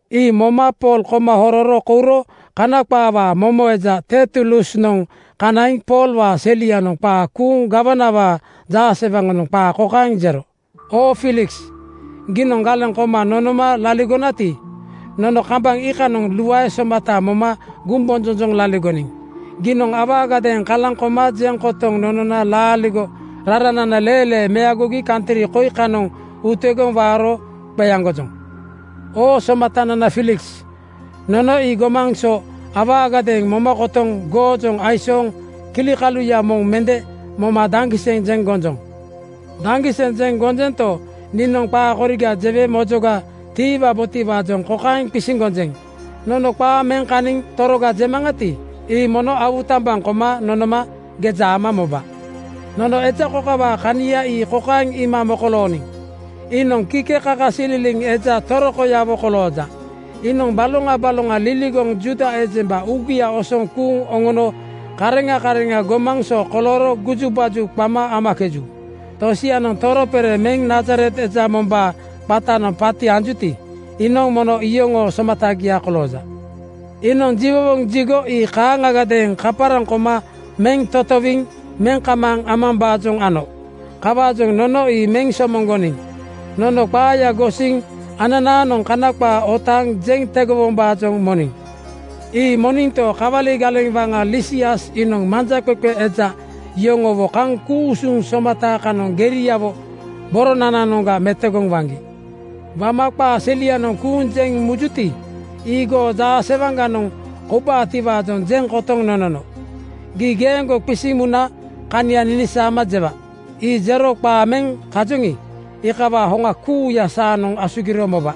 Ii moma Pool koma hororo kouro Kana qaawaa momo eja Tertulusnoŋ kanaiŋ Poolwaa selianoŋ qaa kuuŋ gawanawaa jaasewaŋanoŋ qaa kokaeŋ jero, “Oo Fiiliks, giinoŋ galeŋ koma nonoma laligonati, nono kambaŋ iikanoŋ luae somata moma gumbonjonjoŋ laligoniŋ. Giinoŋ awaagadeeŋ kalaŋ koma jeŋ kotoŋ nonona laaligo raranana leelee meagogi kantri koi kanoŋ utegoŋ waaro qeaŋgojoŋ. Oo somatanana Fiiliks, nono ii gomaŋ so awaagadeeŋ moma kotoŋ goojoŋ aisooŋ kilikaluya moŋ mende moma daŋgiseŋ jeŋ gonjoŋ. Daŋgiseŋ jeŋ gonjonto, niinoŋ qaa koriga jewe mojoga tiiwabotiwaajoŋ kokaeŋ qisiŋ gonjeŋ: Nono qaa meŋ kaniŋ toroga jemaŋati, ii mono awutambaŋ koma nonoma geja ama moba. “Nono eja kokawaa kania ii kokaeŋ iima mokolooniŋ: Iinoŋ kikekakasililiŋ eja torokoyawo kolooja. Iinoŋ baloŋa baloŋa liligoŋ Juuda ejemba uugia osoŋ kuuŋ oŋono kareŋa kareŋa gomaŋ so kolooro gujubaju qama amakeju. Tosianoŋ toropere meŋ Nazaret eja mombaa qatanoŋ paati anjuti, iinoŋ mono iyoŋoo somatagia kolooja. Iinoŋ jiwowoŋ jigo ii kaaŋagadeeŋ kaparaŋ koma meŋ totowiŋ meŋ kamaaŋ amambaajoŋ ano. Kawaajoŋ nono ii meŋ somoŋgoniŋ. Nono qaaya gosiŋ ananaanoŋ Kana qaa otaaŋ jeŋ tegowombaajoŋ moniŋ. (Ii moninto, kawali galeŋ waŋa Lisias iinoŋ manjaqeqe eja yoŋowo kaŋ ku-usuŋ somata kanoŋ geriawo boronananoŋga metogoŋ waŋgi. Wama qaa selianoŋ kuuŋ jeŋ mujuti, ii goo jaasewaŋganoŋ koubutiwaajoŋ jeŋ kotoŋ nonono.) Gii geeŋgo qisiŋ muna kania ninisaama jewa. Ii jero qaa meŋ kajoŋi, iikawaa hoŋa kuuya saanoŋ asugiro moba.”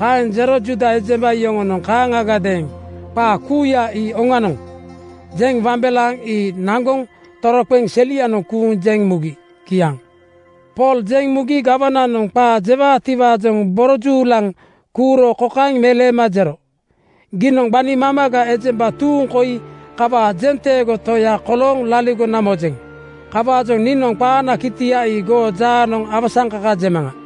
Kaeŋ jero Juuda ejemba yoŋonoŋ kaaŋagadeeŋ “Qaa kuuya ii oŋanoŋ,” jeŋ wambelaaŋ ii naŋgoŋ toroqeŋ selianoŋ kuuŋ jeŋ mugi. Kiaŋ. Pool jeŋ mugi gawananoŋ qaa jewaatiwaajoŋ borojuulaŋ kuuro kokaeŋ meleema jero, “Giinoŋ gbani mamaga ejemba tuuŋ koi kawaa jenteego toya kolooŋ laligona mojeŋ. Kawaajoŋ niinoŋ qaanaa kitia ii goo jaaganoŋ awasaŋkaka jemaŋa.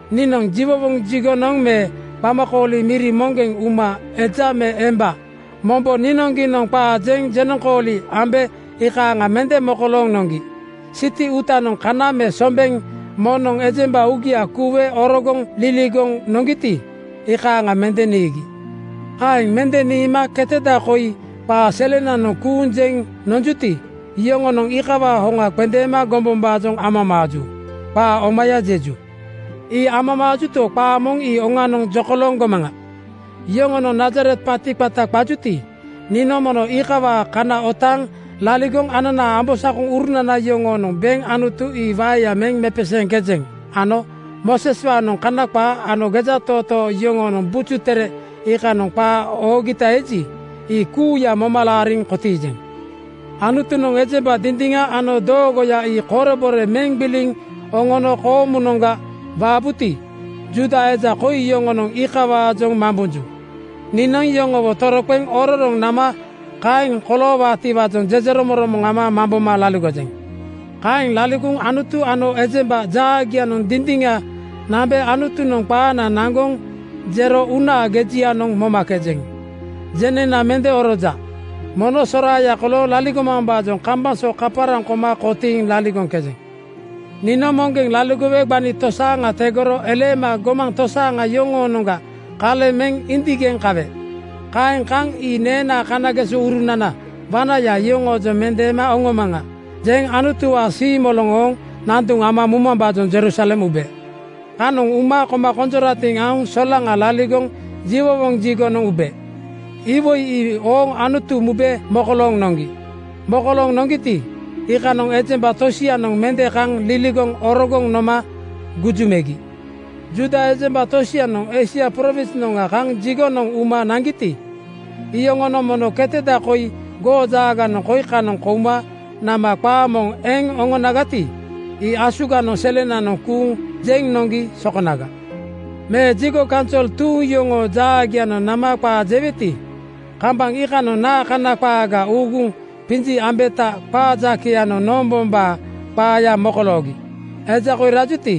Niinoŋ jiwowoŋ jigonoŋ me qamakooli miri moŋgeŋ uma eja me emba mombo niinoŋgiinoŋ qaa jeŋ jenoŋkooli ambe iikaaŋa mende mokolooŋ noŋgi. Siti uutanoŋ kana me sombeŋ moŋnoŋ ejemba uugia kuuwe orogoŋ liligoŋ noŋgiti, iikaaŋa mende niigi. “Kaeŋ mende niima keteda koi qaa selenanoŋ kuuŋ jeŋ nonjuti, yoŋonoŋ iikawaa hoŋa qendeema gombombaajoŋ amamaaju. Qaa omaya jeju. Ii amamaajuto, qaa moŋ ii oŋanoŋ jokolooŋ gomaŋa: Yoŋonoŋ Nazaret paati qata qajuti, niinoŋ mono iikawaa kana otaaŋ laligoŋ ananaa ambosakoŋurunana yoŋoonoŋ beŋ Anutu ii waeya meŋ mepeseeŋkejeŋ ano Mooseswaanoŋ Kana qaa ano gejatootoo yoŋoonoŋ Buju Tere iikanoŋ qaa oogita eji, ii kuuya moma laariŋ kotiijeŋ. Anutunoŋ ejemba dindiŋa ano doogoya ii korebore meŋ gbiliŋ oŋono koomunoŋga waabuti, Juuda eja koi yoŋonoŋ iikawaajoŋ mambonju. Niinoŋ yoŋowo toroqeŋ ororoŋ nama kaeŋ koloowaatiwaajoŋ jejeromoŋromoŋ ama mamboma laligojeŋ. Kaeŋ laligoŋ Anutu ano ejemba jaagianoŋ dindiŋa nambe Anutunoŋ qaana naŋgoŋ jero uunaa gejianoŋ momakejeŋ. Jeneŋna mende oroja. Mono soraaya kolooŋ laligomambaajoŋ kambaŋ so kaparaŋ koma kotiiŋ laligoŋkejeŋ. “Niinoŋ moŋgeŋ laligowe gbani tosaaŋa tegoro eleema gomaŋ tosaaŋa yoŋoonoŋga kaleŋ meŋ indigeŋ kawe. Kaeŋ kaŋ ‘Ii neenaa kanagesourunana wanaya yoŋoojoŋ mendeema oŋomaŋa,’ jeŋ Anutuwaa siimoloŋ ooŋ nanduŋ ama mumambaajoŋ Jerusalem ube. Kanoŋ uma koma konjoratiŋ aoŋ solaŋa laligoŋ jiwowoŋ jigonoŋ ube. Iwoi ii ooŋ Anutu mube mokolooŋ noŋgi. Mokolooŋ noŋgiti, iikanoŋ ejemba tosianoŋ mende kaŋ liligoŋ orogoŋ noma guju megi. Juuda ejemba tosianoŋ Eisia prowinsnoŋga kaŋ jigonoŋ uma niigiti, iyoŋonoŋ mono keteda koi goo jaaganoŋ koi kanoŋ kouma nama qaa moŋ eŋ oŋonagati, ii asuganoŋ selenanoŋ kuuŋ jeŋ noŋgi sokonaga. “Me jigo kaunsol tuuŋ yoŋoo jaagianoŋ nama qaa jeweti, kambaŋ iikanoŋ naa Kana qaaga uuguŋ qinji ambeta qaa jakeyanoŋ noombombaa qaaya mokoloogi? Eja koi rajuti,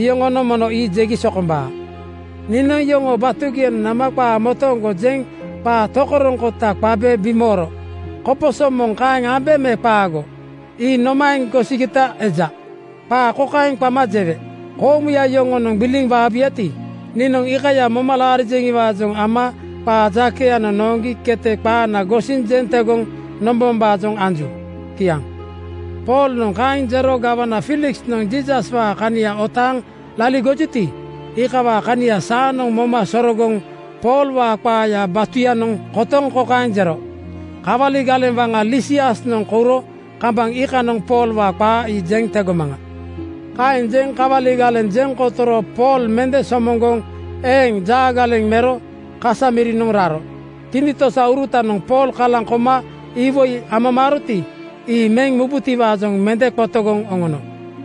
iyoŋonoŋ mono ii jegi sokombaa. Niinoŋ yoŋoo batugianoŋ nama qaa motooŋgo jeŋ qaa tokoroŋkota qabe bimooro. Koposo moŋ kaeŋ ambe me qaago? Ii nomaeŋ gosigita eja? Qaa kokaeŋ qama jewe, ‘Koomuya yoŋonoŋ gbiliŋ waabuyati, niinoŋ iikaya moma laarijeŋiwaajoŋ ama qaa jakeyanoŋ nooŋgi kete qaana gosiŋ jeŋ tegoŋ nombombaajoŋ anju.’” Kiaŋ. Poolnoŋ kaeŋ jero gawana Fiiliksnoŋ Jiisaswaa kania otaaŋ laligojuti, iikawaa kania saanoŋ moma sororogoŋ Poolwaa qaaya batuyanoŋ kotoŋ kokaeŋ jero, “Kawali galeŋ waŋa Lisiasnoŋ kouro kambaŋ iikanoŋ Poolwaa qaa ii jeŋ tegomaŋa.” Kaeŋ jeŋ kawali galeŋ jeŋ kotoro Pool mende somoŋgoŋ eeŋ jaagaleŋ mero kasa mirinoŋ raro. Tinitosaurutanoŋ Pool kalaŋ koma iwoi amamaaroti, ii meŋ mubutiwaajoŋ mende qotogoŋ oŋono.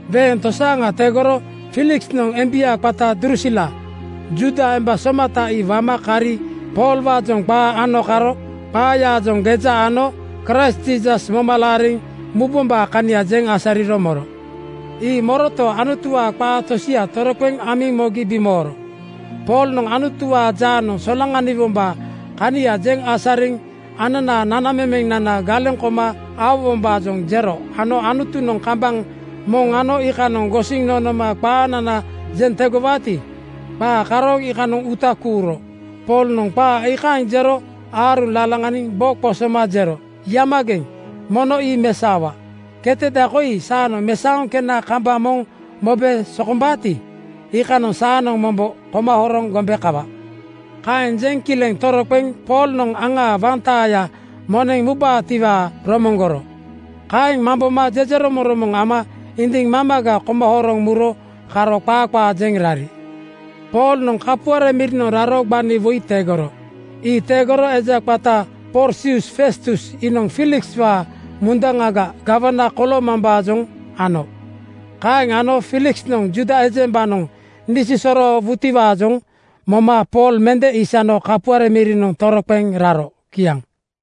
Weeŋ tosaaŋa tegoro Fiiliksnoŋ embia qata Drusila, Juuda emba somata ii wama kari Poolwaajoŋ qaa ano karo qaayaajoŋ geja ano Kraist Jiisas moma laariŋ mubombaa kania jeŋ asariro moro. Ii moroto, Anutuwaa qaa tosia toroqeŋ amiŋ mogi bimooro. Poolnoŋ Anutuwaa jaanoŋ solaŋaniwombaa kania jeŋ asariŋ ananaa nanamemenana galeŋ koma aowombaajoŋ jero ano Anutunoŋ kambaŋ moŋ ano iikanoŋ gosiŋ nonoma qaanana jeŋ tegowaati, qaa karooŋ iikanoŋ uuta kuuro. Poolnoŋ qaa iikaaŋ jero aaruŋ lalaŋaniŋ bo qosoma jero, “Yamageŋ! Mono ii mesaowa. Keteda koi saanoŋ mesaoŋ kena kambaŋ moŋ mobe sokombaati, iikanoŋ saanoŋ mombo koma horoŋ gombe kawa.” Kaeŋ jeŋ kileŋ toroqeŋ Poolnoŋ aŋa wantaaya moneŋ mubaatiwaa romoŋgoro. Kaeŋ mamboma jejeromoŋromoŋ ama indiŋ mamaga koma horoŋ muro karo qaa qaa jeŋ rari. Poolnoŋ kapuare mirinoŋ raro gbani woi tegoro. Ii tegoro eja qata Porsius Festus iinoŋ Fiilikswaa mundaŋaga gawana koloomambaajoŋ ano. Kaeŋ ano Fiiliksnoŋ Juuda ejembanoŋ nisosoroowutiwaajoŋ moma Pool mende isano kapuare mirinoŋ toroqeŋ raro. Kiaŋ.